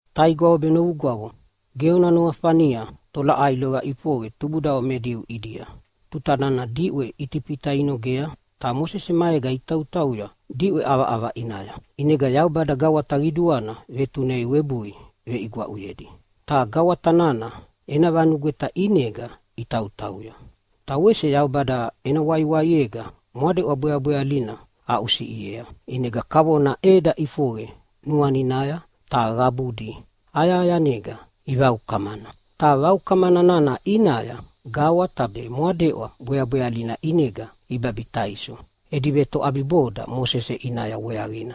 Taigwavo be novugwavo, ge ona nuafania tolaʼai lova ʼifoqe tubudavo me Diu ʼidia tuta nana diʼwe Itifita inogea ta Mosese maega itautauya diʼwe ʼavaʼava ʼinaya. ʼInega Yaubada gawata qiduana vetunei webui veʼigwaʼuyedi. Ta gawata nana ena vanugweta ʼinega itautauya. Ta wese Yaubada ena waiwaiega Mwadeʼwa Bweabwealina aʼusiʼiea ʼinega kavona ʼeda ʼifoqe nuaninaya ta qabudi ayahayanega ivaukamana. Ta vaukamana nana ʼinaya gawata be Mwadeʼwa Bweabwealina ʼinega ibabitaiso edi vetoʼabiboda Mosese ʼinaya weaqina.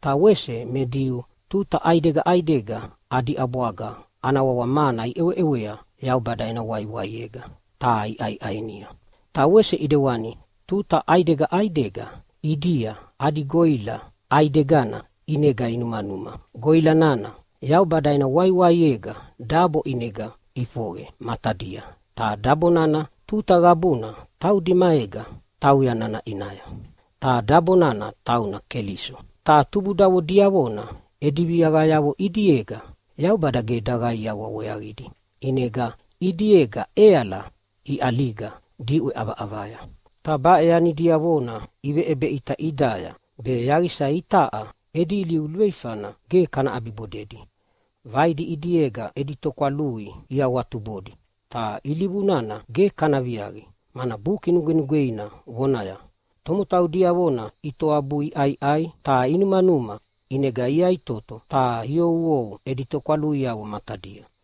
Ta wese me Diu tuta ʼaidega ʼaidega adi ʼabwaga ana wawa “mana” iʼeweʼewea Yaubada ena waiwaiega ta iʼaiʼainia. Ta wese ʼidewani tuta ʼaidega ʼaidega ʼidia adi goʼila ʼaidegana ʼinega inumanuma. Goʼila nana Yaubada ena waiwaiega dabo ʼinega ʼifoqe matadia, ta dabo nana tuta qabuna taudi maega tauya nana ʼinaya. Ta dabo nana tauna Keliso. Ta tubudavo diavona edi viaqayavo ʼidiega Yaubada ge daqaiawa weaqidi, ʼinega ʼidiega ʼeala iʼaliga diʼwe ʼavaʼavaya. Ta baʼe yani diavona iveʼebeʼita ʼidaya be yaqisa itaʼa edi ilivu luveifana ge kana ʼabibodedi. Vaidi ʼidiega edi tokwalui iawatubodi, ta ilivu nana ge kana viaqi, mana Buki Nugwenugweina vonaya, “Tomotau diavona itoabui iʼaiʼai ta inumanuma, ʼinega iyaʼitoto ta iouou edi tokwaluiavo matadia.”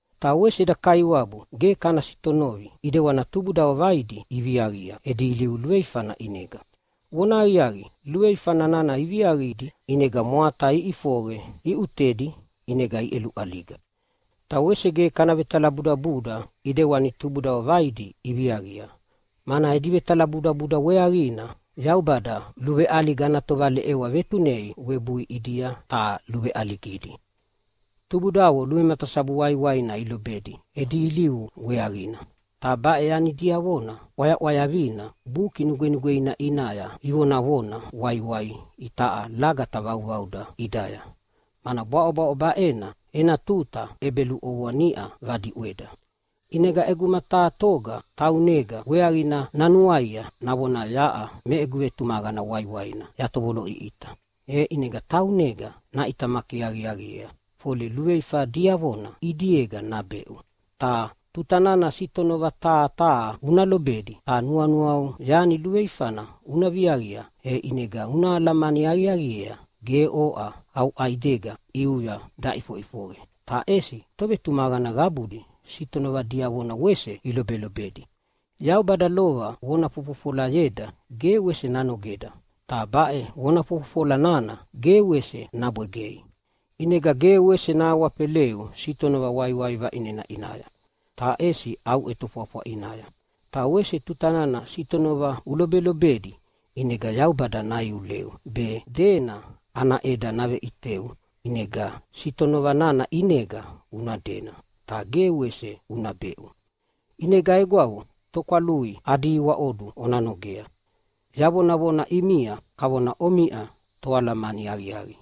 Ta wese eda Kaiwabu ge kana sitonovi ʼidewani tubudavo vaidi iviaqia edi ilivu luveifana ʼinega. Vona aqiaqi, luveifa nana iviaqidi ʼinega mwata iʼifoqe iʼutedi ʼinega iʼeluʼaliga. Ta wese ge kana vetalabudabuda ʼidewani tubudavo vaidi iviaqia, mana edi vetalabudabuda weaqina Yaubada luveʼaliga ana tovaleʼewa vetunei webui ʼidia ta luveʼaligidi. Tubudavo luvematasabu waiwaina ilobedi edi ilivu weaqina, ta baʼe yani diavona ʼwayaʼwayavina Buki Nugwenugweina ʼinaya ivonavona waiwai itaʼa lagata vauvauda ʼidaya, mana bwaʼobwaʼo baʼena ena tuta ʼebeluʼovoa niʼa vadiʼweda. ʼInega ʼeguma taha toga taunega weaqina nanuaia navonaya, “Yaʼa me egu vetumaqana waiwaina yatovoloʼiʼita!” E ʼinega taunega naʼitamaki aqiaqiea fole luveifa diavona ʼidiega nabeʼu. Ta tuta nana sitonova taha taha una lobedi ta nuanuau yani luveifana una viaqia, e ʼinega una alamani aqiaqiea ge oʼa au ʼaidega ʼiuya daʼifoʼifoqe, ta ʼesi tovetumaqana qabudi sitonova diavona wese ilobelobedi. Yaubada lova vona fofofolayeda ge wese nanogeda, ta baʼe vona fofofola nana ge wese nabwegei. ʼInega ge wese nahawafeleu sitonova waiwai vaʼinena ʼinaya, ta ʼesi au ʼetofwafwa ʼinaya. Ta wese tuta nana sitonova ulobelobedi ʼinega Yaubada naiuleu be dena ana ʼeda naveʼiteu ʼinega sitonova nana ʼinega una dena, ta ge wese una beʼu. ʼInega egwavo, tokwalui adi iwaʼodu ona nogea. Yavonavona ʼimia kavona omiʼa toalamani aqiaqi,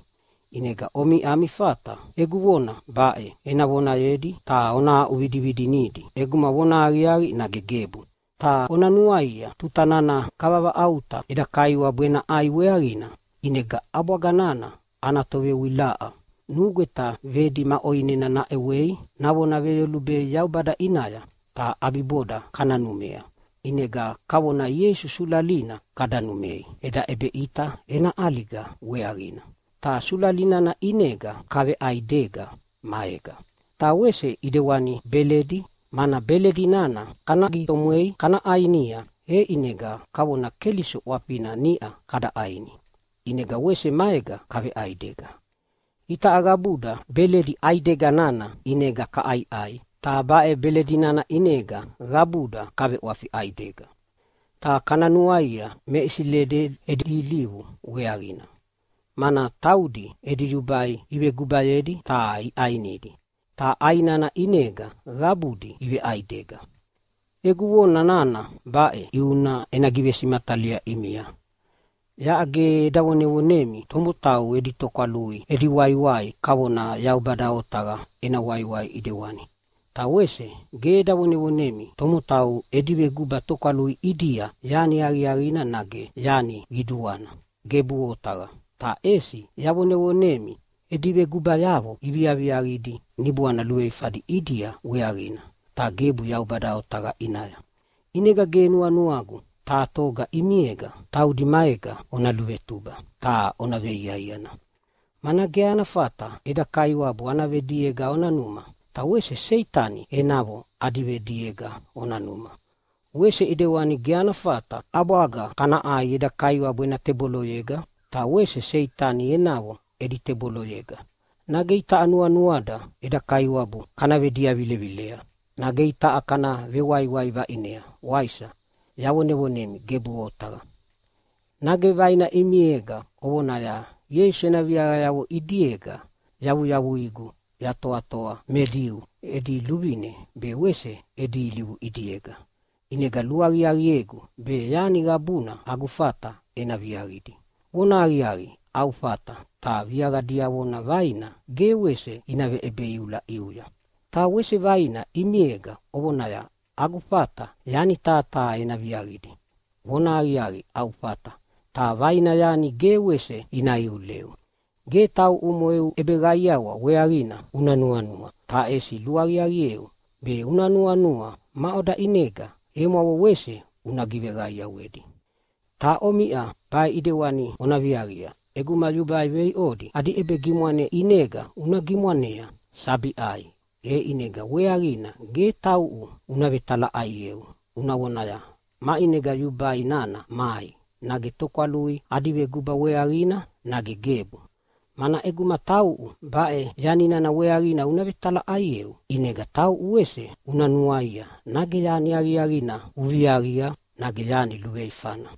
ʼinega omiʼa ami fata egu vona baʼe ena vonayedi ta ona aʼuvidividinidi ʼeguma vonahaqiaqi nage gebu. Ta ona nuaia, tuta nana kavavaʼauta eda Kaiwabu ena ʼAi weaqina ʼinega ʼabwaga nana ana tovewilaʼa nugweta vedi ma ʼoinena naʼewei navona veyolubei Yaubada ʼinaya, ta ʼabiboda kana numea. ʼInega kavona Ieisu sulalina kada numei eda ʼebeʼita ena ʼaliga weaqina, ta sulala nana ʼinega kaveʼaidega maega. Ta wese ʼidewani beledi, mana beledi nana kana gitomwei kana ʼainia, e ʼinega kavona Keliso ʼwafina niʼa kada ʼaini, ʼinega wese maega kaveʼaidega. Itaʼa qabuda beledi ʼaidega nana ʼinega kaʼaiʼai, ta baʼe beledi nana ʼinega qabuda kaveʼwafi ʼaidega. Ta kana nuaia me Isileli edi ilivu weaqina, mana taudi edi yubai ivegubayedi ta iʼainidi, ta ʼai nana ʼinega qabudi iveʼaidega. Egu vona nana baʼe ʼiuna ena givesimatalia ʼimia. Yaʼa ge eda vonevonemi tomotau edi tokwalui edi waiwai kavona Yaubada otaqa ena waiwai ʼidewani. Ta wese ge eda vonevonemi tomotau edi veguba tokwalui ʼidia yani aqiaqina nage yani qiduana. Gebuʼe otaqa! Ta ʼesi yavonevonemi edi vegubayavo iviaviaqidi niboana luveifadi ʼidia weaqina, ta gebu Yaubada otaqa ʼinaya. ʼInega ge nuanuagu taha toga ʼimiega taudi maega ona luvetuba ta ona veiaiana. Mana ge ana fata eda Kaiwabu ana vediega ona numa, ta wese Seitani enavo adi vediega ona numa. Wese ʼidewani ge ana fata ʼabwaga kana ʼai eda Kaiwabu ena teboloyega, ta wese Seitani enavo edi teboloyega. Nage itaʼa nuanuada eda Kaiwabu kana vediavilevilea? Nage itaʼa kana vewaiwai vaʼinea, waisa? Yavonevonemi, gebuʼe otaqa! Nage vaina ʼimiega ovonaya, “Ieisu ena viaqayavo ʼidiega yavuyavuigu yatoatoa me Diu edi luvine be wese edi ilivu ʼidiega, ʼinega luaqiaqiegu be yani qabuna agu fata ena viaqidi.” Vonahaqiaqi, au fata, ta viaqa diavona vaina ge wese ina veʼebeiula ʼiuya. Ta wese vaina ʼimiega ovonaya, “Agu fata yani taha taha ena viaqidi.” Vonahaqiaqi, au fata, ta vaina yani ge wese ina iuleu. Ge tauʼumo eu ʼebeqaiawa weaqina una nuanua, ta ʼesi luaqiaqieu be una nuanua maʼoda ʼinega emwavo wese una giveqaiawedi. Ta omiʼa baʼe ʼidewani ona viaqia: ʼEguma yubai veiʼodi adi ʼebegimwane ʼinega una gimwanea sabi ʼai, e ʼinega weaqina ge tauʼu una vetalaʼaieu una vonaya, “Maʼinega yubai nana mai, nage tokwalui adi veguba weaqina, nage gebu?” Mana ʼeguma tauʼu baʼe yani nana weaqina una vetalaʼaieu ʼinega tauʼu wese una nuaia nage yani aqiaqina uviaviaqia nage yani luveifana.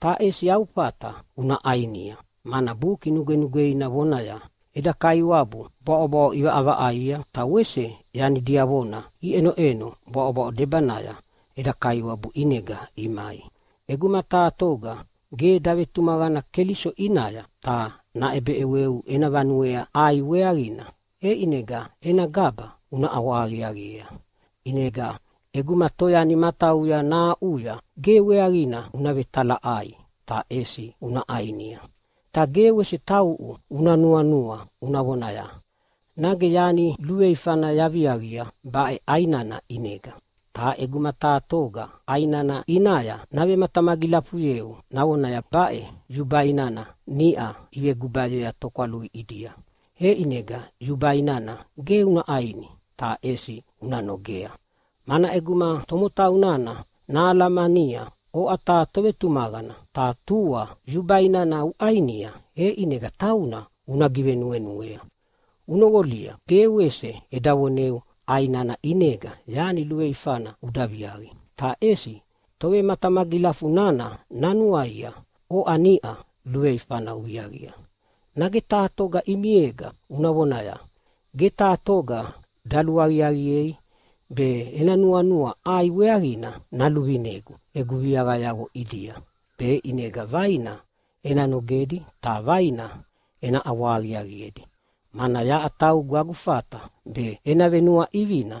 Ta ʼesi au fata una ʼainia, mana Buki Nugwenugweina vonayea, “Eda Kaiwabu bwaʼobwaʼo ʼivaʼavaʼaia, ta wese yani diavona iʼenoʼeno bwaʼobwaʼo debanaya eda Kaiwabu ʼinega imai.” ʼEguma taha toga ge davetumaqana Keliso ʼinaya ta naʼebeʼeweu ena vanuea ʼai weaqina, e ʼinega ena gaba una ʼawahaqiaqiea. ʼInega ʼeguma toyani matauya nahaʼuya ge weaqina una vetalaʼai ta ʼesi una ʼainia. Ta ge wese tauʼu una nuanua una vonaya, “Nage yani luveifana yaviaqia baʼe ʼai nana ʼinega?” Ta ʼeguma taha toga ʼai nana ʼinaya navematamagilafuyeu navonaya, “Baʼe yubai nana niʼa ivegubayea tokwalui ʼidia.” E ʼinega yubai nana ge una ʼaini ta ʼesi una nogea, mana ʼeguma tomotau nana nahalamania oʼa taha tovetumaqana ta tua yubai nana uʼainia, e ʼinega tauna una givenuenuea. Unoqolia, ge wese eda voneu ʼai nana ʼinega yani luveifana uda viaqi, ta ʼesi tovematamagilafu nana nanuaia oʼa niʼa luveifana uviaqia. Nage taha toga ʼimiega una vonaya, “Ge taha toga daluaqiaqiei be ena nuanua ʼai weaqina naluvinegu egu viaqayavo ʼidia, be ʼinega vaina ena nogedi ta vaina ena ʼawahaqiaqiedi, mana yaʼa taugu agu fata be ena venuaʼivina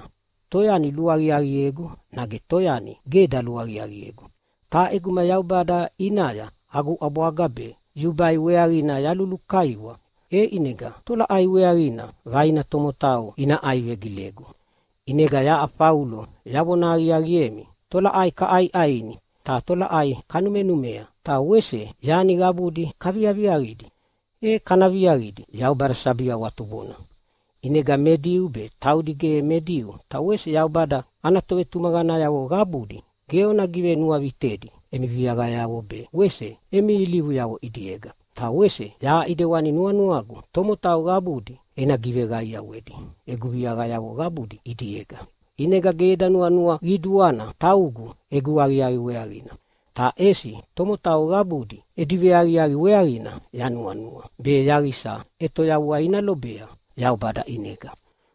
toyani luaqiaqiegu nage toyani ge daluaqiaqiegu. Ta ʼeguma Yaubada ʼinaya agu ʼabwaga be yubai weaqina yalulukaiwa, e ʼinega tolaʼai weaqina vaina tomotau ina ʼaivegilegu?” ʼInega yaʼa Faulo yavona aqiaqiemi, tolaʼai kaʼaiʼaini ta tolaʼai kanumenumea, ta wese yani qabudi kaviaviaqidi, e kana viaqidi Yaubada sabi awatubona. ʼInega me Diu be taudi ge me Diu ta wese Yaubada ana tovetumaqanayavo qabudi ge ona givenuavitedi emi viaqayavo be wese emi ilivuyavo ʼidiega. Ta wese yaʼa ʼidewani nuanuagu tomotau qabudi ena giveqaiawedi egu viaqayavo qabudi ʼidiega. ʼInegana ge eda nuanua qiduana taugu egu aqiaqi weaqina, ta ʼesi tomotau qabudi edi veaqiaqi weaqina yanuanua, be yaqisa ʼetoyavua ina lobea Yaubada ʼinega.